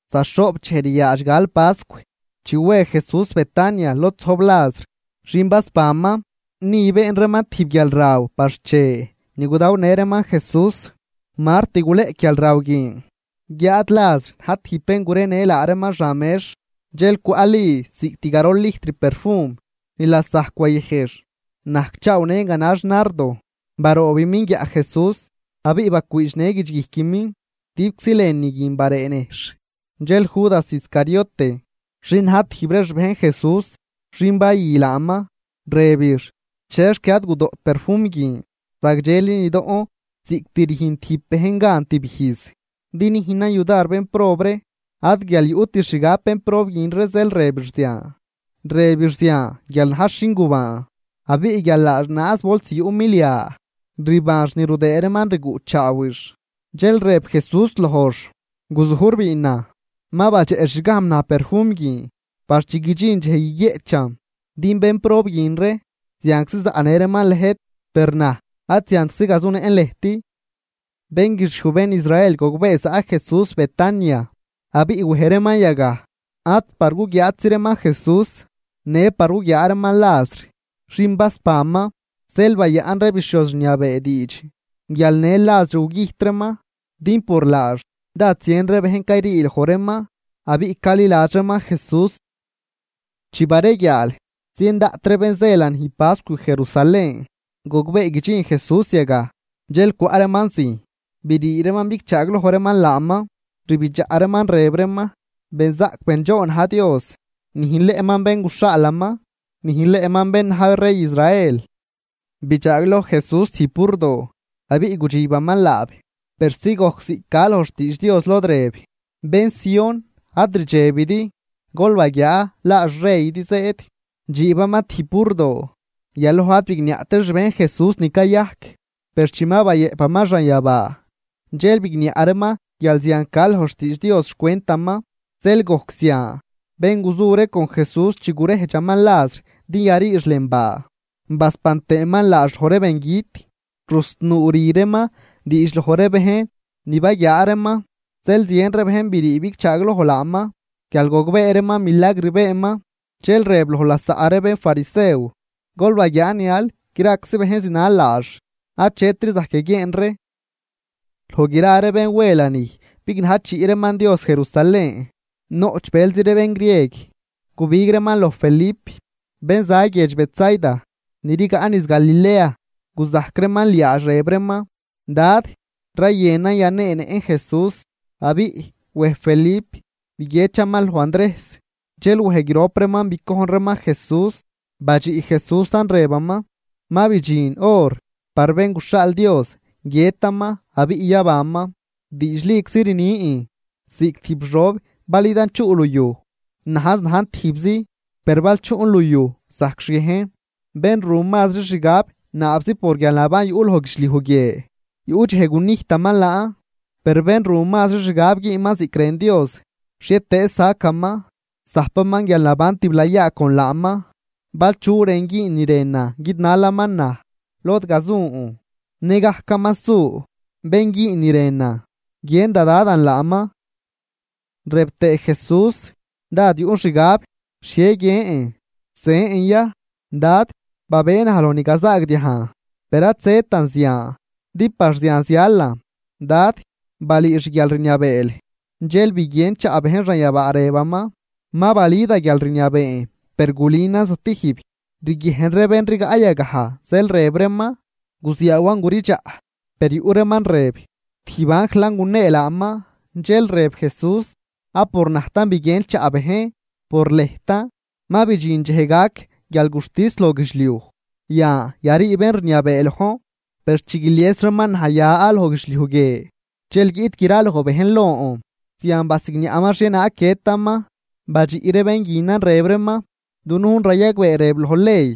Za xhoꞌp dxej riaadx gal pascw, chi we Jesús Betania, lod zojb Lazr, xin basbanman. Ni been reeman tijb guialraw par xche ni gudawnë reeman Jesús. Mart guleꞌc guialraw guin, guiáad Lazr na̱j tijb bén gurenë laa reeman xan mex. Dxel cwaꞌ Li cost garol lijtr perfum ni lasajc wayëjx, najcchaawnën ganax nardo, baroobimin guiaꞌ Jesús abiꞌ bacwiidxnë guidxguijquimin. Guidibczi lënü guin baree nejxh. Dxel Judas Iscariote, xin na̱j tijb ree xbejn Jesús, xin bayü laaman, rëbix: ―¿Chexc ad gudoꞌt perfum guin? Zagdxeli nidoꞌn ziꞌct rüjn tijb bejn gan tib ijz, din nüjnan yudar bénprob ree. Ad guial yuꞌtix xgab bénprob guin ree zeel rëbix zian, rëbix zian guial najx xin gubaan. Abiꞌ guial laax naaz bols yuꞌ milia, rbanx ni rudëë reeman rguꞌchaawix. Dxel rëb Jesús lojx: ―Guzujr biinan. Ma badxeꞌxgajm naj perfum guin par chi guidxin dxej guiguieꞌchan. Din bénprob guin ree zianczi zaꞌnë reeman lëjt, per naj ad ziantczi gazunëꞌn lëjt. Bén guixiuj bén Israel gogbee zaꞌ Jesús Betania, abiꞌ wej reeman yagaj, ad par guguiaatzi reeman Jesús, në par guguiaa reeman Lazr, xin basbanman. Zeel bayaꞌn ree bixhioz rniabee diidx guial në Lazr gugüjt reeman. Din por laax dád zien ree bejn cayrii loj reeman, abiꞌ caliladx reeman Jesús. Chi bareguiaal, zien daꞌt ree bén zë lanij pascw Jerusalén gogbee guidxin Jesús yagaj, dxel cwaꞌ reeman zijn, brii reeman bigchaagloj reeman laaman, rbidxaꞌ reeman rëb reeman: ―¡Benzaꞌc bendxoon na̱j Dios! ¡Nüjnleꞌman Bén guxhaalaman! ¡Nüjnleꞌman bén na̱j rey Israel! Bidxaagloj Jesús tijb burdoo, abiꞌ gudxibaman laab, persi gojc ziꞌc ca loj xtiidx Dios lod rëb: Bén Sión, ad rdxebidi. Gol baguiaa, laa xreydi zëëd, dxiibaman tijb burdoo. Yaloj ad bigniaꞌt ree xbejn Jesús ni cayajc. Per chi ma bayëꞌpaman xanyabaa, dxel bigniaꞌ reeman guial zian ca loj xtiidx Dios xcwentaman, zeel gojc zian. Bén guzu ree con Jesús chi guredxaman Lazr din yariix lën baa, basban tëëman laax loj ree bengüt, rusnuu rü reeman diidx loj ree bejn ni baguiaa reeman. Zeel zien ree bejn brii bigchaagloj laaman, guial gogbee reeman milagr beenman. Dxel rëb loj lasaꞌ ree bénfarisew: ―Gol baguiaa nial graczi bejn zinal laax, achetri zajc yaguieen ree. Loj gra ree bén we lanij bignajchiꞌ reeman Dios Jerusalén, noꞌch bëlzi ree bén grieg, gubig reeman loj Felip, bén za guiedx Betsaida, ni rigaꞌ niz Galilea, guzajc reeman liaadx rëb reeman: ―Dad, rayënan yaneenëꞌn Jesús. Abiꞌ wej Felip biguiedxaman loj Andrejs, dxel wej grop reeman bicojn reeman Jesús. Badxiꞌ Jesúsan rëbaman: ―Ma bidxin hor par Bén guxhaal Dios, guiëtaman abiꞌ yabanman. Diidxliczi rnin, ziꞌc tijb xob bal idan chuꞌ luyuj najz najn tijbzi, per bal chuꞌn luyuj zajcxhiejn. Bén ru mazri xgab naabzi por guialnaban yuꞌ loj guidxliuj guie, yuꞌ dxej gunijtaman laan, per bén ru mazri xgab güünman ziꞌc rën Dios, xhietëëz sacaman, zajpaman guialnaban tiblayaa con laaman. Bal chu rën güün ni rënan guidnalaman naj, lod gazun, nëgajcaman su. Bén güün ni rënan, guiën da Dadan laaman. Rëb tëë Jesús: ―Dád yuꞌn xgab. ¿Xhie guiën? ¿Zën ya: “Dad, babëë naj loj ni gazaagdiajn”? Per ad zëtan zian, din par zian zialan. Dad, balüü xguialrniabeel. Dxel biguien chaꞌ bejn xanyabaa rëbaman: ―¡Ma balü da guialrniabeen, per gulünan stijb! Riguiejn ree bén rigaꞌ yagaj, zeel rëb reeman: ―Guziaawan guridxaꞌ. Per yuꞌ reeman rëb: ―Tijb anjlan gunee laaman. Dxel rëb Jesús: ―Ad por najtan biguien chaꞌ bejn, por lëjtan. Ma bidxin dxej gac guialguxtis loj guidxliuj, yan yarii bén rniabee lojn. Per chi guilies reeman naj ya loj guidxliuj guie, dxel guiꞌt graloj bejn lon. Zian basigniaꞌman xhienaag guiëtaman. Badxiꞌ ree bén guinan rëb reeman: ―Dunujn rayagbee rëb loj ley,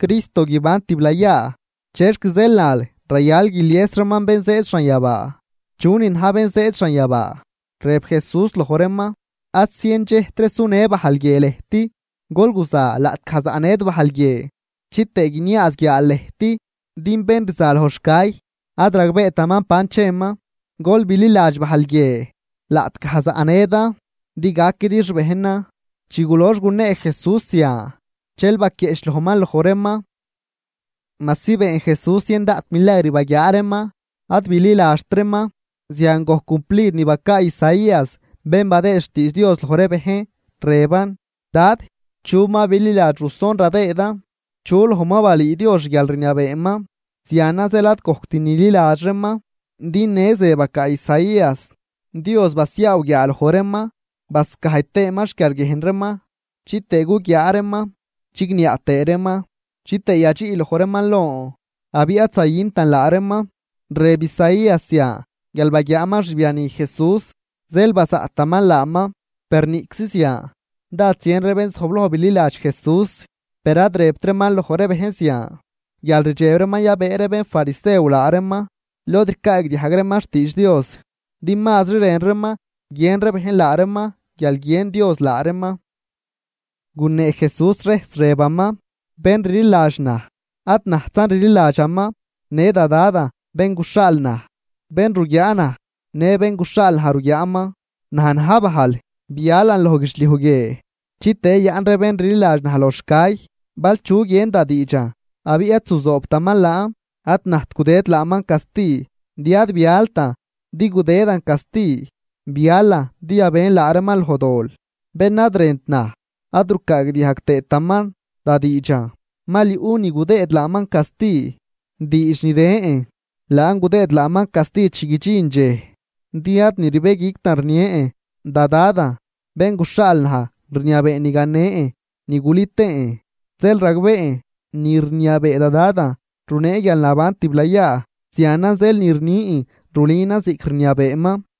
Cristo guiban tiblayaa. ¿Chexc zeel nal, rayal guilies reeman Bén zëëd xanyabaa? ¿Chunin na̱j Bén zëëd xanyabaa? Rëb Jesús loj reeman: ―Ad zien dxejtri sunë bajl guie lëjt. Gol guza laꞌtgaj zaꞌnëdi bajl guie, chitëë guiniaaz guiaal lëjt. Din bén rza loj xcay, ad ragbeetaman ban cheman. Gol bililadx bajl guie, laꞌtgaj zaꞌnëdan, din gaquidi xbejnan. Chi gulox gunee Jesús zian, dxel baquieꞌchlojman loj reeman. Majsi been Jesús zien daꞌt milagr baguiaa reeman, ad bililadxt reeman. Zian gojc cumplid ni bacaa Isaías bén badëë xtiidx Dios loj ree bejn, rëban: Dad, ¿chu ma bililadx ruson radëëdan? ¿Chu loj ma balüü Dios xguialrniabeeman? Zianan zeel ad gojct nililadx reeman, din në ze bacaa Isaías: Dios basiaaw guiaaloj reeman, bascajy tëëman xquiarguiejn reeman, chitëë guguiaa reeman chigniaꞌ tëë reeman, chitëë yadxiꞌ loj reeman lon, abiꞌ ad zayüntan laa reeman. Rëb Isaías zian guial baguiaaman xbiani Jesús, zeel bazaꞌtaman laaman. Per niꞌczi zian, dád zien ree bén zojbloj bililadx Jesús. Per ad rëbt reeman loj ree bejn zian, guial rdxeb reeman yabëë ree bénfarisew laa reeman lod ricaagdiajg reeman xtiidx Dios, din mazri rën reeman guiën ree bejn laa reeman, guial guiën Dios laa reeman. Gunee Jesús rejs rëbaman: ―Bén rliladx naj, ad najtzan rliladxaman, në da Dadan bén guxhaal naj. Bén ruguiaa naj, në bén guxhaal naj ruguiaaman. Naj na̱j bajl, bialan loj guidxliuj guie, chitëë yayaꞌn ree bén rliladx naj loj xcay. Bal chu guien da diidxan abiꞌ ad zuzoobtaman laan, ad najt gudëd laaman casti, din ad bialtan din gudëdan casti, bialan din yabën laa reeman loj dol. Bén ad rënt naj ad rucaagdiajg tëëtaman da diidxan, mal yuꞌ ni gudëëd laaman casti: diidx ni rën, laan gudëëd laaman casti chi guidxin dxej. Din ad ni rbëguictan rnien. Da Dadan, Bén guxhaal naj rniabee ni ganen ni gulü tëën, zeel ragbeen, ni rniabee da Dadan runee guialnaban tiblayaa. Zianan zeel ni rnin rulünan ziꞌc rniabeeman.